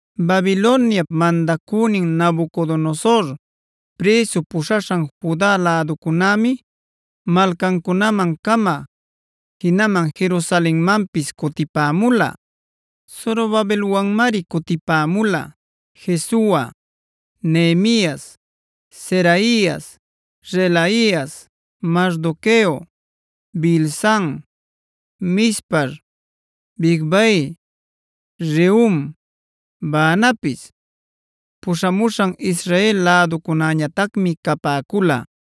Babiloniap mandacünin Nabucodonosor prïsu puśhaśhan Juda läducunämi malcancunaman-cama, jinaman Jerusalenmanpis cutipämula. Zorobabelwanmari cutipämula: Jesua, Nehemias, Seraias, Reelaias, Mardoqueo, Bilsan, Mispar, Bigvai, Rehum, Baanapis. Puśhamuśhan Israel läducunäñatacmi capäcula: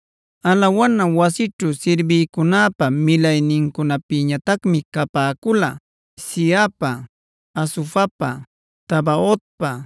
Alawana wasićhu sirbïcunäpa milaynincunapïñatacmi capäcula: Zihapa, Hasufapa, Tabaotpa,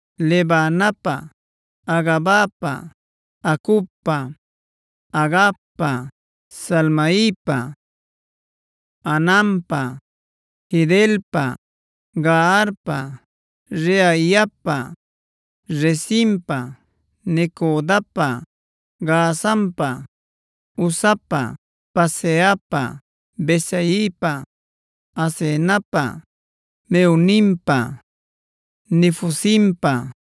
Lebanapa, Hagabapa, Acubpa, Hagabpa, Salmaipa, Hananpa, Gidelpa, Gaharpa, Reaiapa, Rezinpa, Necodapa, Gazampa, Uzapa, Paseahpa, Besaipa, Asenapa, Meunimpa, Nefusimpa,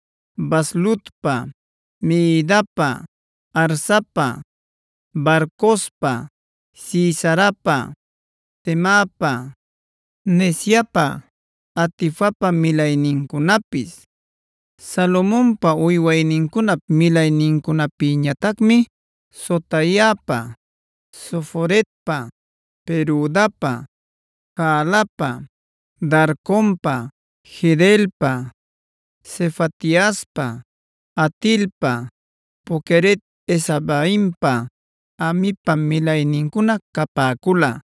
Bazlutpa, Mehidapa, Harsapa, Barcospa, Sisarapa, Temapa, Neziapa, Hatifapa milaynincunapis. Salomonpa uywaynincunap milaynincunapïñatacmi: Sotaipa, Soferetpa, Perudapa, Jaalapa, Darconpa, Gidelpa, Sefatiaspa, Hatilpa, Poqueret-hazebaimpa, Amipa milaynincuna capäcula.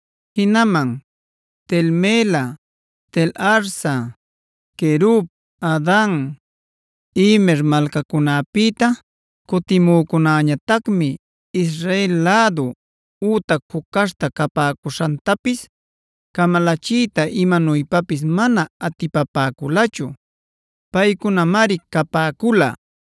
Jinaman Tel-mela, Tel-harsa, Querub, Addan, Imer malcacunapïta cutimücunäñatacmi Israel lädu ütac juc caśhta capäcuśhantapis camalachiyta imanuypapis mana atipapäculachu. Paycunamari capäcula: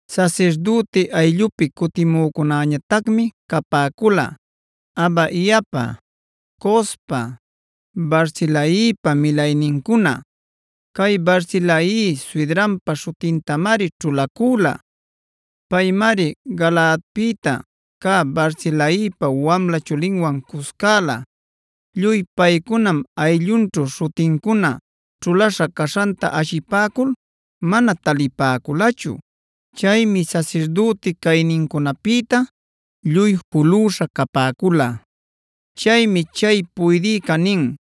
Sasirdüti ayllupi cutimücunäñatacmi capäcula: Habaiapa, Cospa, Barzilaipa milaynincuna. Cay Barzilai suydrunpa śhutintamari ćhulacüla. Paymari Galaadpïta cä Barzilaipa wamla chulinwan cuscäla. Lluy paycunam ayllunćhu śhutincuna ćhulaśha caśhanta ashipäcul mana talipäculachu. Chaymi sasirdüti caynincunapïta lluy julüśha capäcula. Chaymi chay puydïcaa nin: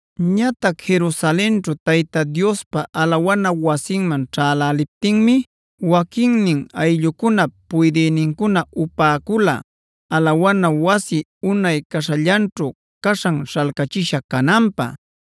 Ñatac Jerusalenćhu Tayta Diospa alawana wasinman ćhäläliptinmi waquinnin ayllucunap puydïnincuna upäcula alawana wasi unay caśhallanćhu caśhan śhalcachisha cananpä.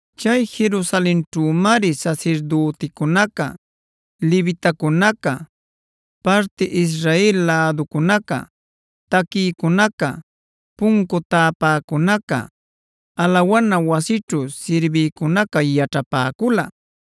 Chay Jerusalenćhümari sasirdüticunaca, levitacunaca, parti Israel läducunaca, taquïcunaca, puncu tapäcunaca, alawana wasićhu sirbïcunaca yaćhapäcula.